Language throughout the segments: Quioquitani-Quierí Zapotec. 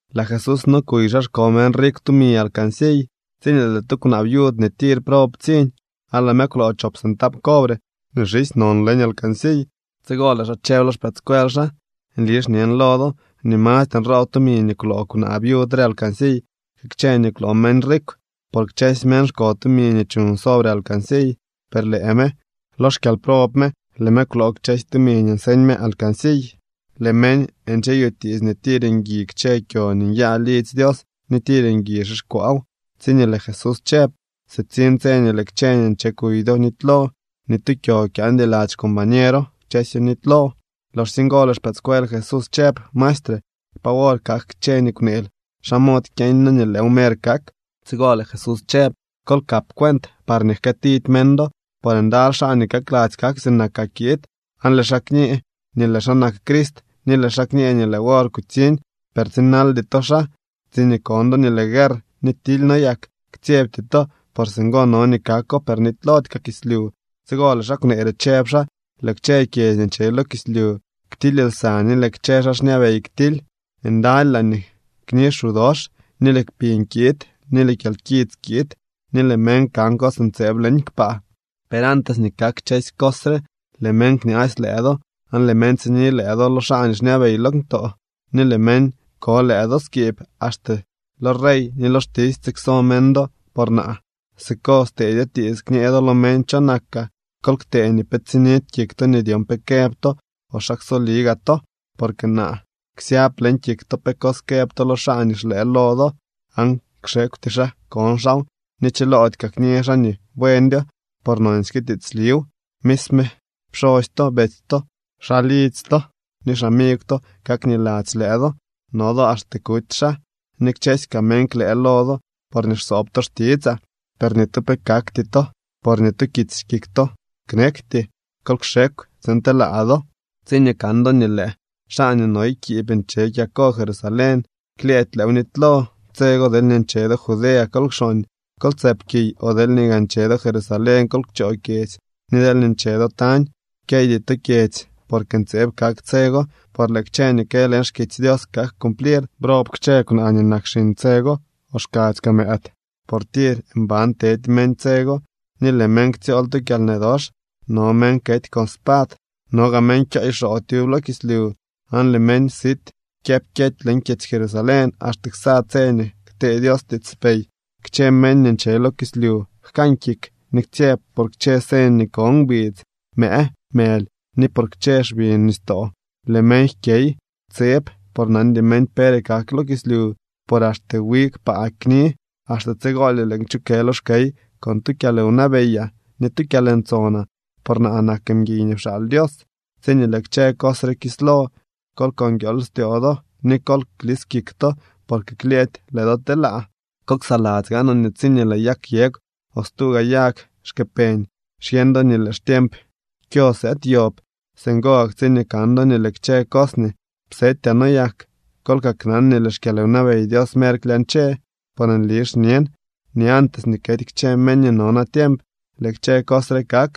Lëë Jesús no kuy xa xko meñ rikw tumi alcansiy tsiñee lëë tu kwnaa viud nii tir prob ptsiñ, aan lëë me kwloo chop centab cobre nii xisy non leñ alcansiy. Tsigo lëë xaa chëb lo xpëëdscuel xaa: —Nli xñen lo do nii mastre nroob tumi nii kwloo kwnaa viud re alcansiy que kchë nii kwloo meñ rikw. Por kchësy meñ xko tumi nii chuñ sobre alcansiy, per lëë me, lo xkyalprob me, lëë me kwloo kchësy tumi nii nseñ me alcansiy. Lëë meñ ncheyutiits nii tir ngui kchë kyo nii nyaa lidzy Dios ni tir ngui xixkwaaw, tsiñee lëë Jesús chëb: —Sitsiñ tse nii lëë kchë nii nche kuy do nitylo. Ni tu kyo kyaandy lady xcombañero. Kchësyo nitylo. Loxsye ngo lëë xpëëdscuel Jesús chëb: —Maestre, ¿pa wor kak kchë nii kwneel? ¿Xa mod kyeeñ noo nii lëëw mer kak? Tsigo lëë Jesús chëb: —Kol kap cuent parñee jkëëtidy meñ do. Por ndaly xaa nii kakladzy kak sinakaa kiid, aan lëë xaa kñë nii lëë xaa nak Crist ni lëë xaa kñë nii lëë wor kutsiñ, per tsinaldy to xaa. Tsiñee kon do nii lëë guerr ni tily noyak, ktsyebty to. Por singo no nii kako, per nitylody kaa kislyu. Tsigo lëë xaa kwnee re chëb xaa: —Lëë kchë kyedzy nii nche lo kislyu ktily lsa ni lëë kchë xaa xñabey ktily. Ndaly laañee kni xu dox, ni lëë kpiñ kiid ni lëë kyalkits kiid, ni lëë meñ kan cos ntseeb leñ kpaa. ’Per antes nii kak kchësy cos re, lëë meñ kñaasy lëë do. Aan lëë meñ tsini lëë do lo xaa nii xñabey leñ ktoo, ni lëë meñ ko lëë do skiib, axte lo rey ni lo xtisy tsikso meñ do por naa. Siko stedyo tiits kñee do lo meñ cho nakaa. Kol ktee nii pe tsinidy kik to nii dyon pe këb to o xa ksoli gaa to, porque naa ksyab leñ kik to pe cos këb to lo xaa nii xlëë lo do. Aan kxekwty xaa con xaaw ni chilody kaa kñë xaa nii buendyo por nonsyke tiitsliw. Misme pxosy to, betsy to, xaa lidzy to ni xamigw to kak niladzy lëë do. No do axte kuty xaa, ni kchësy kaa meñ klëë lo do porñee xsoob to xtitsaa. Per ni tu pe kakty to por ni tu kits kik to knekty. Kol kxekw tsiin telaa do. ’Tsiñee kan do nii lëë xaa nii noy kiib nche kyako Jerusalén, klyëëdy lëëw nitylo. Tse go deelñee nche do Judea, kol kxooñ, kol tsëp kiy. O deelñee gaa nche do Jerusalén, kol kchoo kyedzy, ni deelñee nche do tañ, kyeydy to kyedzy. Porque ntseeb kak tse go, por lëë kchë nii kë leñ xkitsy Dios kak cumplir. ¡Brob kchë kwnaa nii nak xiñ tse go o xkadzy kaa mëëd! Por tir mban tedy meñ tse go ni lëë meñ ktsyool tu kyalnë dox. No meñ kety con spad, no gaa meñ kyooy xoo tyub lo kislyu. Aan lëë meñ sit kyëpkyety leñ kyedzy Jerusalén axte ksa tse nii ktee Dios tiitspey. ’Kchë meñ ni nche lo kislyu jkan kik ni ktsyeb por kchë señ nii ko ngbidz, mëë, mëly ni por kchë xbi nistoo. Lëë meñ jkyey tseb por nandy meñ pere kak lo kislyu. Por axte wi kpaa kni. Axte tsigolye lëën kchukë lo xkey con tu kyalwnabeyaa ni tu kyalntsonaa, por naa nak mguiy nii pxaal Dios. Tsiñee lëë kchë cos re kislo, kol ko nguiool styoo do ni kol klis kik to, porque klyëëdy lëë do telaa. ’Kol ksaladzy gaanoo nii tsiñee lëë yag yegw o stu gaa yag xkë peñ, xyeñ do nii lëë xtiemp kyo sëëd yob. Singo gak tsiñee kan do nii lëë kchë cos nii psetyaa noyak, kol kaknan nii lëë xkyalwnabey Dios mer klyañche. ’Por nli xñen nii antes nii kety kchë meñ nii no natiemp lëë kchë cos re kak.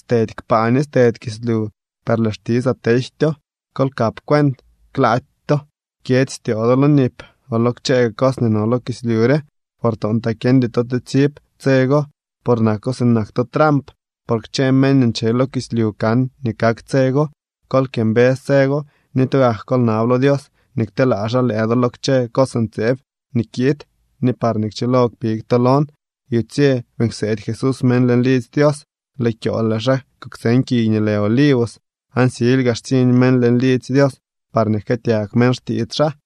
Stedy kpaa ni stedy kislyu, per lëë xtitsaa tejtyo. ’Kol kap cuent klaady to jkyedzy styoo do lo nip o lo kchë gaa cos nii no lo kislyu re, por toontlaa kyeñdy to tsitsib tse go. Por nako sinak tu tramp. Por kchë meñ nii nche lo kislyu kan nii kak tse go. Kol kyëmbës tse go ni tugak kol nab lo Dios nii kteelaa xaa lëë do lo kchë cos ntseeb nii kiid ni parñee kchilo kpig to lon. Yutsye beeñ kseedy Jesús meñ leñ lidzy Dios, lëë kyool lëë xaa kuktseñ kiy nii lë Olivos. Aan silyga xtsiñ meñ leñ lidzy Dios parñee jkëëtyag meñ xtiits xaa.